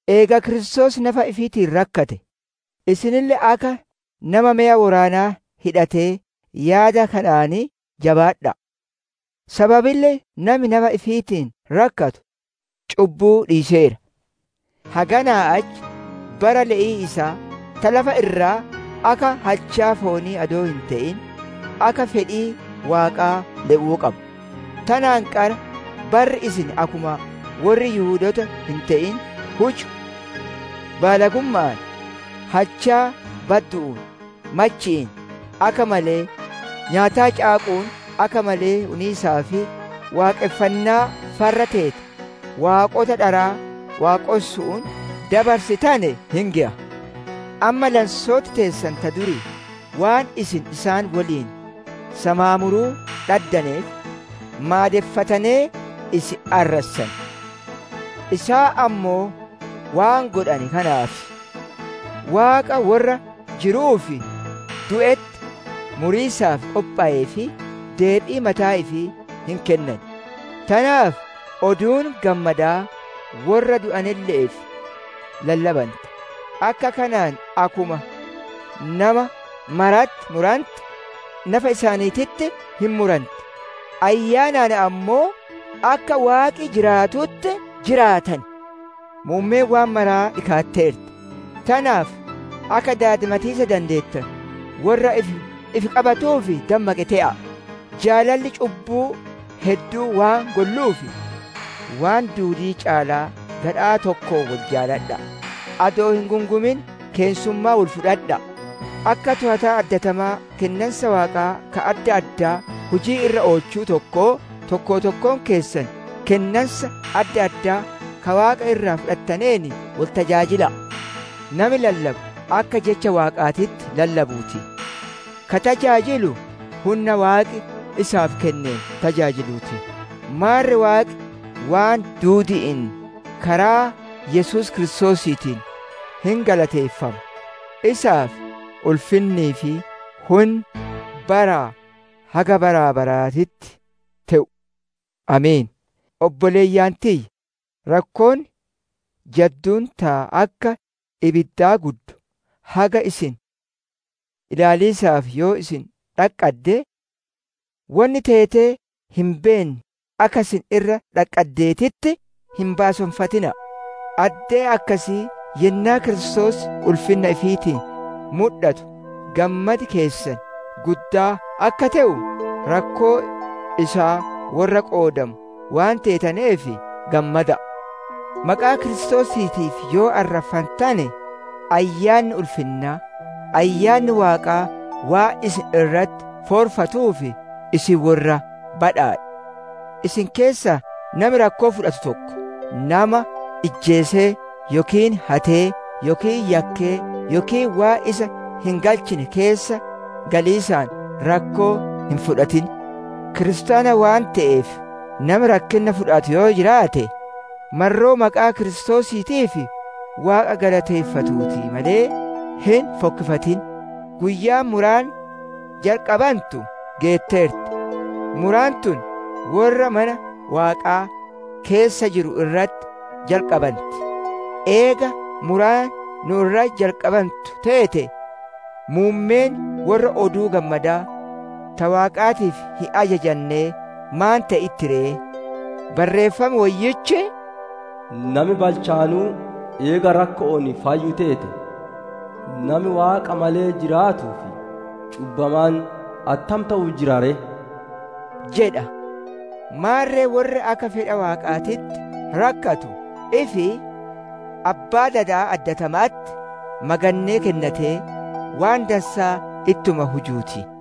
Eega Kiristoos nafa ifiitiin rakkate, isinille akka nama meya woraanaa hidhatee yaada kanaan jabaadha'a; sababille nami nafa ifiitiin rakkatu cubbuu dhiiseera. Haganaa achi bara le'ii isaa ta lafa irraa, akka halchaa foonii adoo hin te'in akka fedhii Waaqaa le'uu qaba. Tanaan qara barri isin akkuma worri Yihudoota hin te'in huju: baalagumma'aan, halchaa baddu'uun, machi'iin, akka malee nyaataa caaqu'uun, akka malee uniisaa fi waaqonfannaa farra teete waaqota dharaa waaqonsu'uun dabarsitane hin geya. Amma lansooti teessan ta durii waan isin isaan woliin samaamuruu dhaddaneef maadeffatanee, isin arrassan. Isaan ammoo waan godhane kanaaf, Waaqa worra jiruu fi du'etti muriisaaf qophoweef, deebii mataa ifii hin kennan. Tanaaf Oduun Gammadaa worra du'anelle'eef lallabante; akka kanaan akkuma nama maratti murante nafa isaaniititti hin muranti; ayyaanaan ammoo akka Waaqi jiraatutti jiraatan. Muummeen waan maraa dhikaatteerti; tanaaf akka daadimatiisa dandeettanu, worra ifi qabatuu fi dammaqe te'a'a. Jaalalli cubbuu hedduu waan golluuf, waan duudii caalaa gadhaa tokkoon wol jaaladha'a. Adoo hin gungumin keessummummaa wol fudhadha'a. Akka toowataa addatamaa kennansa Waaqaa ka adda addaa hujii irra oolchu tokkoo, tokko tokkoon keessan kennansa adda addaa ka Waaqa irraa fudhataneen wol tajaajila'a. Nami lallabu akka Jecha Waaqaatitti lallabuu ti; ka tajaajilu hunna Waaqi isaaf kenneen tajaajiluu ti; maarre Waaqi waan duudi'iin karaa Yesuus Kiristoosiitiin hin galateeffama. Isaaf ulfinnii fi hunni baraa haga bara baraatitti te'u! Ameen. Obboleeyyan tiyya! Rakkoon jadduun ta akka ibiddaa guddu haga isin ilaaliisaaf yoo isin dhaqqadde, wonni teetee hin beenne akka isin irra dhaqqaddeetitti hin baaseffatina'a. Addee akkasii yennaa Kiristoos ulfinna ifiitiin mudhatu gammadi keessan guddaa akka te'u, rakkoo isaa worra qoodamu waan teetaneef gammada'a. Maqaa Kiristoosiitiif yoo arraffantane, Ayyaanni ulfinnaa, Ayyaanni Waaqaa waan isin irratti foorfatuuf isin worra badhaadhe. Isin keessaa nami rakkoo fudhatu tokko, nama ijjeesee yookiin hatee yookiin yakkee yookiin waan isa hin galchine keessa galiisaan rakkoo hin fudhatin. Kiristaana waan te'eef nami rakkinna fudhatu yoo jiraate, marroo maqaa Kiristoosiitiif Waaqa galateeffatuu ti malee, hin fokkifatin. Guyyaan muraan jalqabantu geetteerti; muraan tun worra mana Waaqaa keessa jiru irratti jalqabanti. Eega muraan nu irratti jalqabantu teete, muummeen worra Oduu Gammadaa ta Waaqaatiif hin ajajannee maan te'itti ree? Barreeffam Woyyichi, «Nami balchaanuu eega rakko'oon fayyu teete, nami Waaqa malee jiraatuu fi cubbamaan attam te'uu jira ree?» jedha. Maarre worri akka fedha Waaqaatitti rakkatu, ifi Abbaa dadaa addatama'atti magannee kennatee, waan dansaa ittuma hujuu ti.